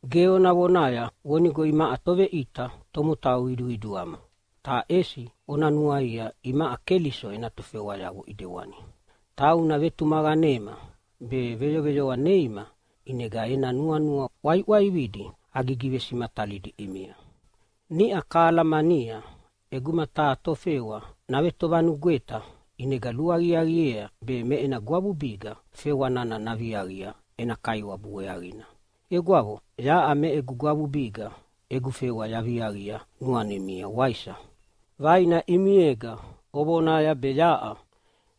Ge ona vonaya vonigo imaʼa toveʼita tomotau qiduqiduama, ta ʼesi ona nuaia imaʼa Keliso ena tofewayavo ʼidewani. Tauna vetumaqanema be veyoveyoa neima, ʼinega ena nuanua ʼwaiʼwaividi agigivesimatalidi ʼimia. Niʼa kahalamania, ʼeguma taha tofewa navetovanugweta, ʼinega luaqiaqiea be me ena gwavubiga fewa nana naviaqia ena kaiwabu weaqina. Egwavo, yaʼa me egu gwavubiga egu fewa yaviaqia nuanimia, waisa? Vaina ʼimiega ovonaya be yaʼa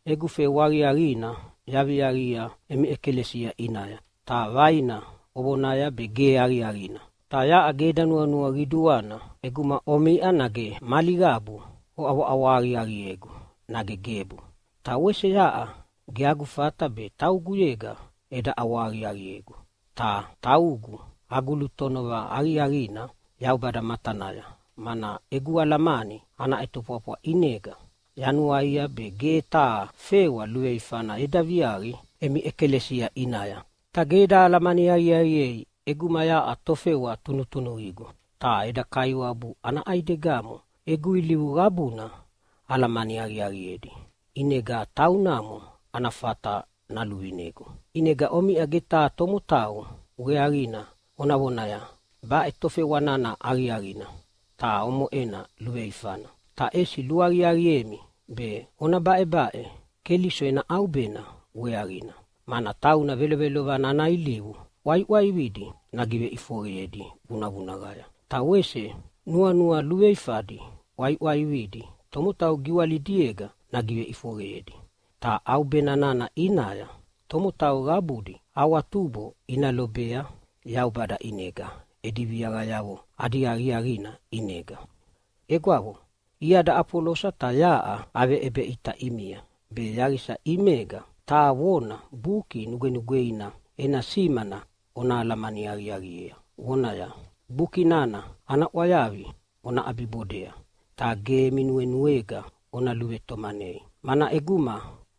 egu fewa aqiaqina yaviaqia emi ʼekalesia ʼinaya, ta vaina ovonaya be ge aqiaqina. Ta yaʼa ge eda nuanua qiduana ʼeguma omiʼa nage mali qabu oʼawahaqiaqiegu nage gebu. Ta wese yaʼa ge agu fata be tauguyega eda ʼawahaqiaqiegu. Ta taugu agu lutonova aqiaqina Yaubada matanaya, mana egu alamani ana ʼetofwafwa ʼinega yanuaia be ge taha fewa luveifana eda viaqi emi ʼekalesia ʼinaya. Ta ge eda alamani aqiaqiei ʼeguma yaʼa tofewa tunutunuqigu. Ta eda Kaiwabu ana ʼaidegamo egu ilivu qabuna alamani aqiaqiedi, ʼinega taunamo ana fata naluvinegu. ʼInega omiʼa ge taha tomotau weaqina ona vonaya, “Baʼe tofewa nana aqiaqina, ta omoʼena luveifana.” Ta ʼesi luaqiaqiemi be ona baʼebaʼe Keliso ena ʼaubena weaqina. Mana tauna velovelovana ana ilivu ʼwaiʼwaividi nagiveʼifoqeyedi vunavunaqaya, ta wese nuanua luveifadi ʼwaiʼwaividi tomotau giwalidiega nagiveʼifoqeyedi. Ta ʼaubena nana ʼinaya tomotau qabudi awatubo ina lobea Yaubada ʼinega edi viaqayavo adi aqiaqina ʼinega. Egwavo, iada Afolosa ta yaʼa aveʼebeʼita ʼimia be yaqisa ʼimega taha vona Buki Nugwenugweina ena simana ona alamani aqiaqiea, vonaya, “Buki nana ana ʼwayavi ona ʼabibodea ta ge emi nuenuega ona luvetomanei.” Mana ʼeguma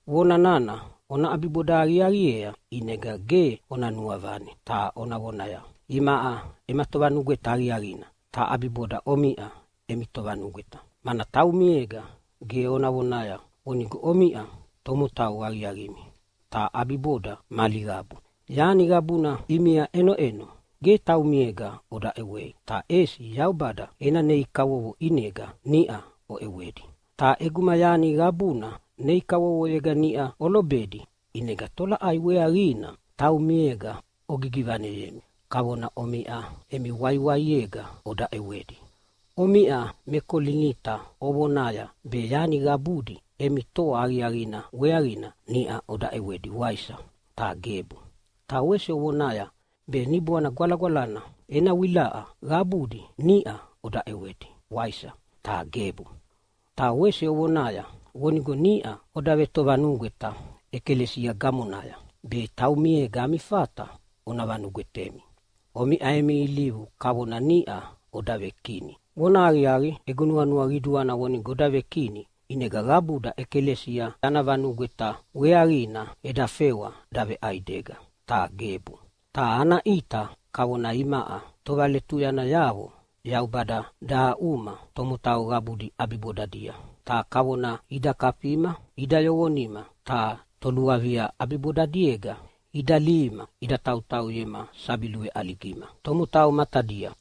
vona nana ona ʼabiboda aqiaqiea ʼinega ge ona nuavane ta ona vonaya, “Imaʼa ema tovanugweta aqiaqina, ta ʼabiboda omiʼa emi tovanugweta.” Mana taumiega ge ona vonaya vonigo omiʼa tomotau aqiaqimi, ta ʼabiboda mali qabu. Yani qabuna ʼimia iʼenoʼeno ge taumiega oda ʼewei, ta ʼesi Yaubada ena nei kavovo ʼinega niʼa oʼewedi. Ta ʼeguma yani qabuna nei kavovoyega niʼa olobedi, ʼinega tolaʼai weaqina taumiega ogivaneyemi kavona omiʼa emi waiwaiega oda ʼewedi? Omiʼa me Kolinita ovonaya be yani qabudi emi toa aqiaqina weaqina niʼa oda ʼewedi, waisa? Ta gebu! Ta wese ovonaya be Niboana Gwalagwalana ena wilaʼa qabudi niʼa oda ʼewedi, waisa? Ta gebu! Ta wese ovonaya vonigo niʼa oda vetovanugweta ʼekalesia gamonaya, be taumiega ami fata ona vanugwetemi. Omiʼa emi ilivu kavona niʼa oda vekini. Vonahaqiaqi, egu nuanua qiduana vonigo oda vekini, ʼinega qabuda ʼekalesia ana vanugweta weaqina eda fewa daveʼaidega. Ta gebu! Ta ana ʼita kavona imaʼa tovaletuyanayavo Yaubada dahaʼuma tomotau qabudi ʼabibodadia. Ta kavona ida kafima ida yoqonima ta toluavia ʼabibodadiega ida lihima ida tautauyema sabi luveʼaligima tomotau matadia.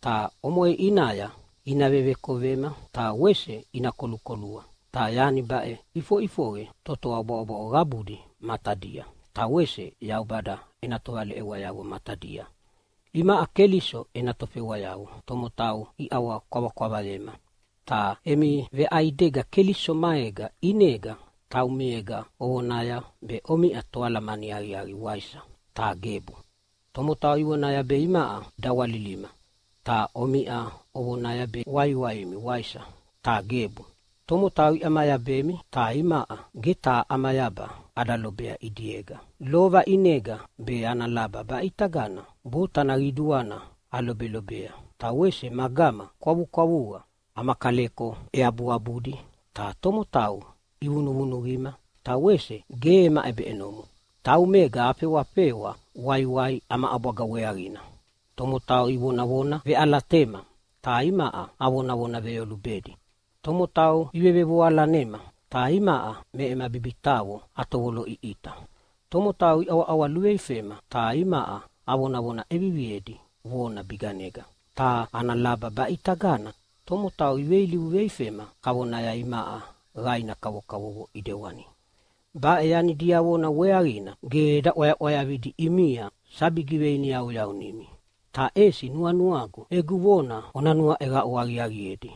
Ta omoʼe ʼinaya ina vevekovema ta wese ina kolukolua. Ta yani baʼe ʼifoʼifoqe totoa bwaʼobwaʼo qabudi matadia, ta wese Yaubada ena tovaleʼewayavo matadia. Imaʼa Keliso ena tofewayavo tomotau iʼawakwavakwavayema, ta emi veʼaidega Keliso maega ʼinega, taumiega ovonaya be omiʼa toalamani aqiaqi, waisa? Ta gebu! Tomotau ivonaya be imaʼa dawalilima, ta omiʼa ovonaya be waiwaimi, waisa? Ta gebu! Tomotau iʼamayabemi, ta imaʼa ge taha ʼamayaba ada lobea ʼidiega. Lova ʼinega be ana laba baʼitagana botana qiduana alobelobea, ta wese magama kwavukwavuqa. Ama kaleko eabuabudi, ta tomotau ivunuvunuqima, ta wese ge ema ʼebeʼenomo. Taumega afewafewa waiwai ama ʼabwaga weaqina. Tomotau ivonavona veʼalatema, ta imaʼa avonavona veyolubedi. Tomotau ivevevoalanema, ta imaʼa me ema bibitaqo atovotovoloʼiʼita. Tomotau iʼawaʼawa luveifema, ta imaʼa avonavona ʼeviviedi vona biganega. Ta ana laba baʼitagana tomotau iveilivu veifema kavona imaʼa qaina kavokavovo ʼidewani. Baʼe yani diavona weaqina ge eda ʼwayaʼwayavidi ʼimia sabi giveiniyauyaunimi, ta ʼesi nuanuagu egu vona ona nuaʼeqaʼu aqiaqiedi,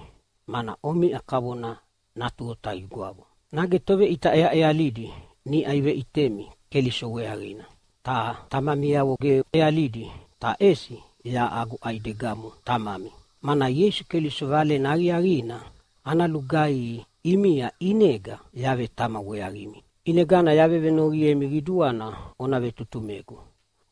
mana omiʼa kavona natu otaqigwavo. Nage toveʼita ʼeaʼealidi niʼa iveʼitemi Keliso weaqina, ta tamamiavo ge ʼealidi, ta ʼesi yaʼa agu ʼaidegamo tamami, mana Ieisu Keliso Valena Aqiaqina ana lugaihi ʼimia ʼinega yavetama weaqimi. ʼInegana yavevenoqiemi qiduana ona vetutumegu.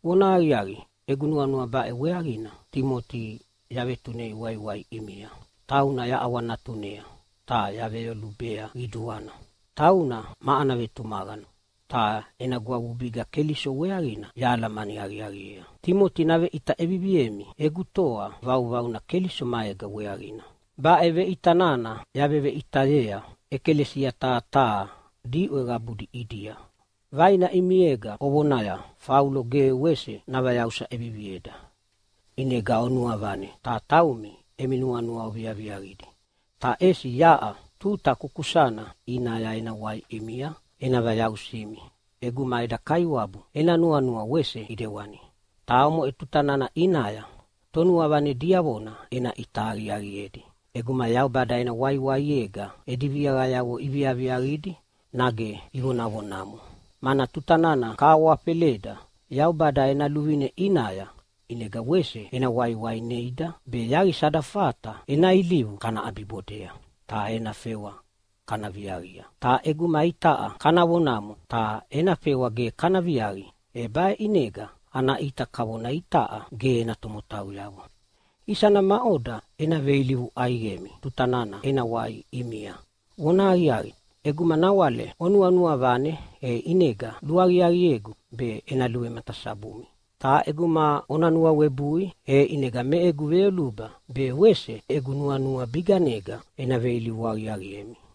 Vonahaqiaqi, egu nuanua baʼe weaqina Timoti yavetunei waiwai ʼimia. Tauna yaʼawanatunea ta yaveyolubea qiduana. Tauna ma ana vetumaqana, ta ena gwavubiga Keliso weaqina yahalamani aqiaqiea. Timoti naveʼita ʼeviviemi egu toa vauvauna Keliso maega weaqina. Baʼe veʼita nana yaveveʼitayea ʼekalesia taha taha diʼwe qabudi ʼidia. Vaina ʼimiega ovonaya, “Faulo ge wese navayausa ʼevivieda.” ʼInega onuavane ta taumi emi nuanua oviaviaqidi. Ta ʼesi yaʼa tuta kukusana ʼinaya ena wai ʼimia ena vayausimi ʼeguma eda Kaiwabu ena nuanua wese ʼidewani. Ta omoʼe tuta nana ʼinaya tonuavane diavona ena ʼita aqiaqiedi ʼeguma Yaubada ena waiwaiega edi viaqayavo iviaviaqidi, nage ivonavonamo. Mana tuta nana kahawafeleda Yaubada ena luvine ʼinaya, ʼinega wese ena waiwai neida be yaqisa ada fata ena ilivu kana ʼabibodea ta ena fewa kana viaqia. Ta ʼeguma itaʼa kana vonamo ta ena fewa ge kana viaqi, e baʼe ʼinega ana ʼita kavona itaʼa ge ena tomotauyavo. Isana maʼoda ena veilivu ʼaiqemi tuta nana ena wai ʼimia? Vonahaqiaqi, ʼeguma nawale onuanua vane, e ʼinega luaqiaqiegu be ena luvematasabumi. Ta ʼeguma ona nuawebui, e ʼinega me egu veyoluba be wese egu nuanua biganega ena veilivu aqiaqiemi.